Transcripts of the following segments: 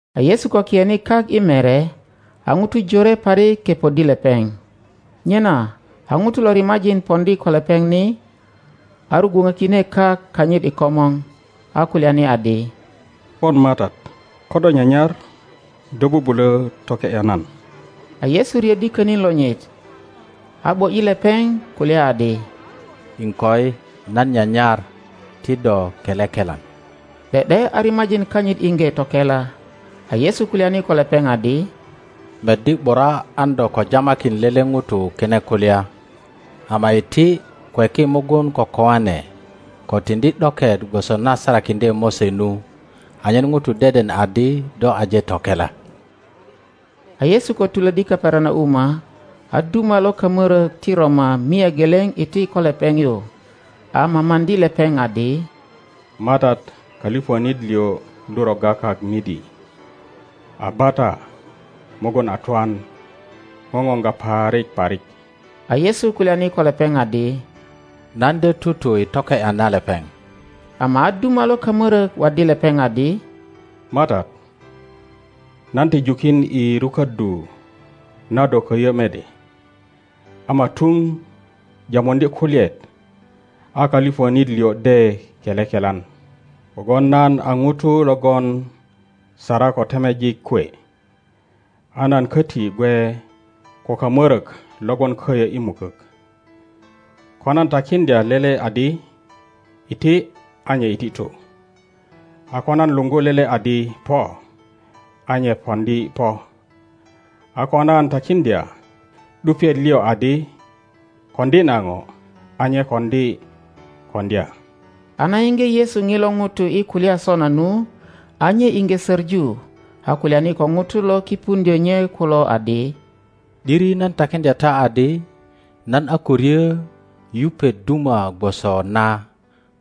A Yesu ko kiyene kak i mere, a ŋutu jore parik kepoddi lepeŋ. Nyena a ŋuto lo rimajin poŋdi ko lepeŋ ni, a rugwuŋökine kak kanyit i komor, a kulyani adi, Pon MATAT, ko do nyanyar do bubulö toke ’ya nan. A Yesu riöddi könin lonyit a ’bo ’yi lepeŋ kulya adi, Iŋkoi, nan nyanyar; ti do kele kelan. ’De ’de a rimajin kanyit iŋge tokela. A Yesu kulyani ko lepeŋ adi, Meddi ’bura an do ko jamakin lele ŋuto kine kulya; ama iti, kweki mugun ko kijane, ko tiŋdi ’doket gwoso na sarakiŋdye Mose nu, anyen ŋutu deden adi do aje tokela. A Yesu ko tulöddi Kapernauma, a duma lo kamörök ti Roma mia geleŋ iti ko lepeŋ yu, a mamaŋdi lepeŋ, adi, MATAT, kölipönit liŋ lu rogga kak midi, a bata mugun a twan, ŋoŋoŋga parik parik. A Yesu kulyani ko lepeŋ adi, Nan de tutu i toke ’ya na lepeŋ. Ama a duma lo kamörök waddi lepeŋ adi, MATAT, nan ti jukin i ruköddu na do köyö mede; ama tuŋ jamuŋdye kulyaet a kölipönit liŋ de kele kelan. Kogwon nan a ŋuto logon sara ko temejik kwe, a nan köti gwe ko kamörök lo gwon köyö i mukök. Ko nan takiŋdya lele adi, Iti, a nye iti tu; a ko nan luŋgu lele adi, Po, a nye poŋdi po; a ko nan takiŋdya ’dupiet liŋ adi, Koŋdi na ŋo, a nye koŋdi koŋdya. A na yiŋge Yesu ŋilo ŋuto i kulya sona nu, a nye iŋge söŋu, a kulyani ko ŋutu lo kipuŋdyö nye kulo adi, ’Diri nan takiŋdya ta adi, nan a ko ryö yupet duma gwoso na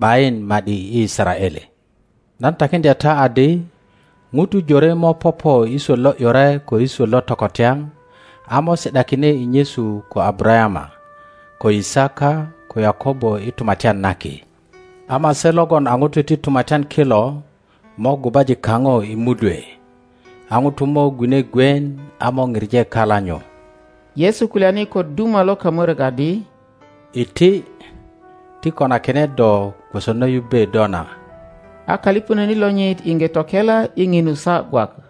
’bayin ma ’di i Yisaraele. Nan takiŋdya ta adi, ŋutu jore mo popo i swöt lo ’yure ko i swöt lo tokotyaŋ, a mo si ’dakine i nyesu ko Abarayama, ko Yisaka, ko Yakobo i Tumatyan na Ki; ama se logon a ŋutu ti Tumatyan kilo mo gubaji kaŋo i mudwe; a ŋutu mo gwine gwien a mo pije kala nyu. a Yesu kulyani ko duma lo kamörök adi, Iti, ti konakine do gwoso na yubbe do na; a kölipönit lonyit iŋge tokela i ŋinu saa gwak.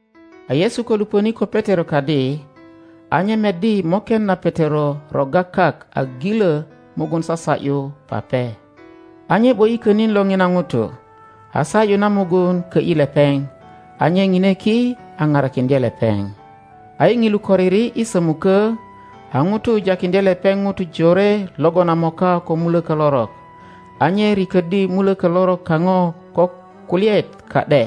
A Yesu ko lupöni ko Petero kadi, a nye meddi moken na Petero rogga kak a gilö mugun sasa ’yu pape. a nye ’bo ’yi könin lo ŋina ŋuto, a sa ’yu na mugun kö ’yi lepeŋ, a nye ŋine ki a parakiŋdye lepeŋ. A i ŋilu koriri i sömukö, a ŋutu jakiŋdye lepeŋ ŋutu jore logon a moka ko mulökö lorok. A nye riköddi mulökö lorok kaŋo ko kulyaet ka ’de,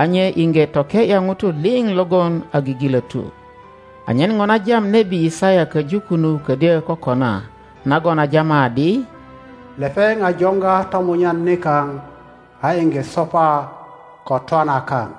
a nye iŋge toke ’ya ŋutu liŋ logon a gigilötu, anyen ŋo na jam nebi Yisaya köju kunu ködyö kokona, nagon a jama adi, Lepeŋ a joŋga tomunyan nikaŋ, a iŋge sopa ko twana kaŋ.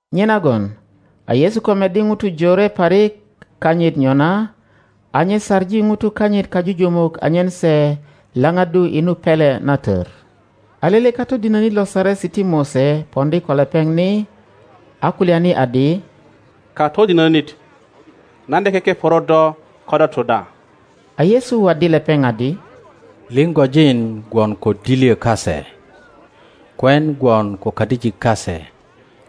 Nyenagon a Yesu ko meddi ŋutu jore parik kanyit nyona, a nye saŋi ŋutu kanyit kajujumuk anyen se laŋaddu i nu pele na tör. a lele katodinönit lo Saresi ti Mose poŋdi ko lepeŋ ni, a kulyani adi, Katodinönit, nan de kekeporo do ko do tu da. a Yesu waddi lepeŋ adi, Liŋgojin gwon ko dilyö kase, kwen gwon ko kadijik kase,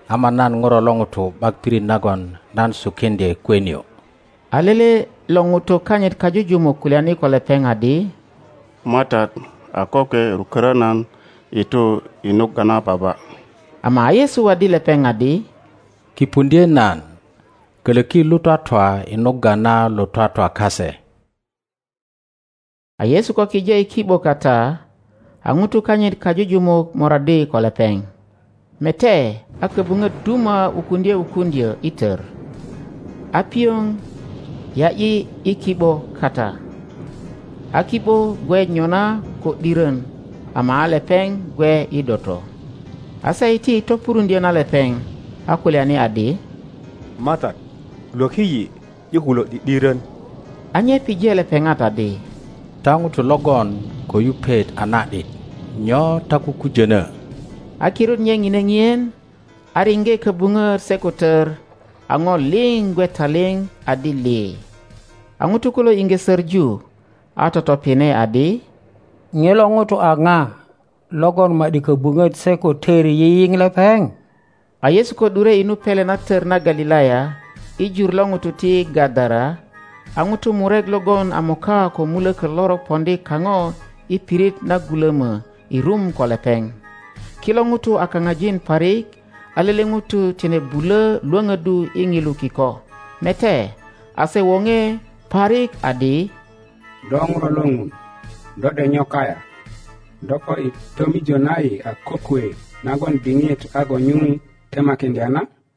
ama nan ŋuro lo ŋuto ’bak pirit nagon nan sukiŋdye kwe nio. a lele lo ŋutu kanyit kajujumuk kulyani ko lepeŋ adi, MATAT, a kokwe rukörö nan i tu i nugga na baba. Ama a Yesu waddi lepeŋ adi, Kipuŋdye nan, kölöki lo twatwa i nugga na lo twatwa kase. A Yesu ko kije i ki ’bo kata, a ŋutu kanyit kajujumuk moraddi ko lepeŋ. Mete, a köbuŋöt duma wukuŋdye wukuŋdyö i tör, a pioŋ ya ’yi i ki ’bö kata, a ki ’bö gwe nyona ko ’dirön; ama a lepeŋ gwe i doto. a se iti i topuruŋdyö na lepeŋ, a kulyani adi, MATAT, lwöki yi, yi kulo ’di ’dirön. A nye pije lepeŋat adi, Ta ŋutu logon ko yupet a na ’dit, nyo ta kukujönö? A kirut nye ŋine ŋien, a riŋge köbuŋöt se ko tör, a ŋo liŋ gwe taliŋ adi lii. A ŋutu kulo iŋge söŋu, a totopine adi, Ŋilo ŋuto a ŋa logon ma ’di köbuŋöt se ko tör yiyiŋ lepeŋ? A Yesu ko ’dure i nu pele na tor na Galilaya i jur lo ŋutu ti Gadara, a ŋutu murek logon a moka ko muloko lorok poŋdi kaŋo i pirit na gulomo i rum ko lepeŋ. Kilo ŋutu a kaŋajin parik a lele ŋuto tine buŋ Iwonoddu i nilu kiko. Mete, a se woŋe parik adi, Do Ŋuro lo Ŋun, do ’dek nyo kayaŋ? Do po ni i tomor na yi a kokwe nagon diŋit a ko nyuŋ temakiŋdya na?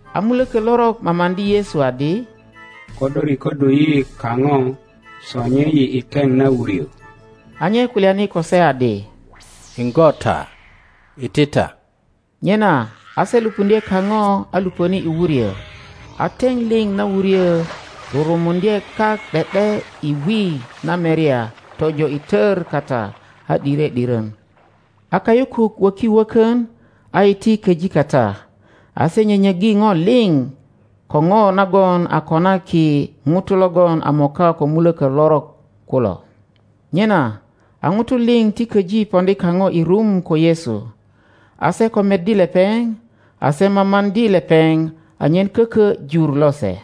A muloko lorok mamaŋdi Yesu adi, Ko do rikoddu yi kaŋo, sonye yi i teŋ na wuryo. A nye kulyani ko se adi, Iŋgo ta, iti ta. Nyena a se lupuŋdye kaŋo a lupöni i wuryo, a teŋ liŋ na wuryo rurumuŋdye kak ’de ’de i wi na merya tojo i tor kata, a ’dire ’diron. a kayukuk wöki wökön, a iti köji kata.A se nyönyöggi ŋo liŋ ko ŋo nagon a konaki ŋutu logon a moka ko muloko lorok kulo. Nyena a ŋutu liŋ ti köji poŋdi kaŋo i rum ko Yesu, a se ko meddi lepeŋ, a se mamaŋdi lepeŋ anyen koko jur lose.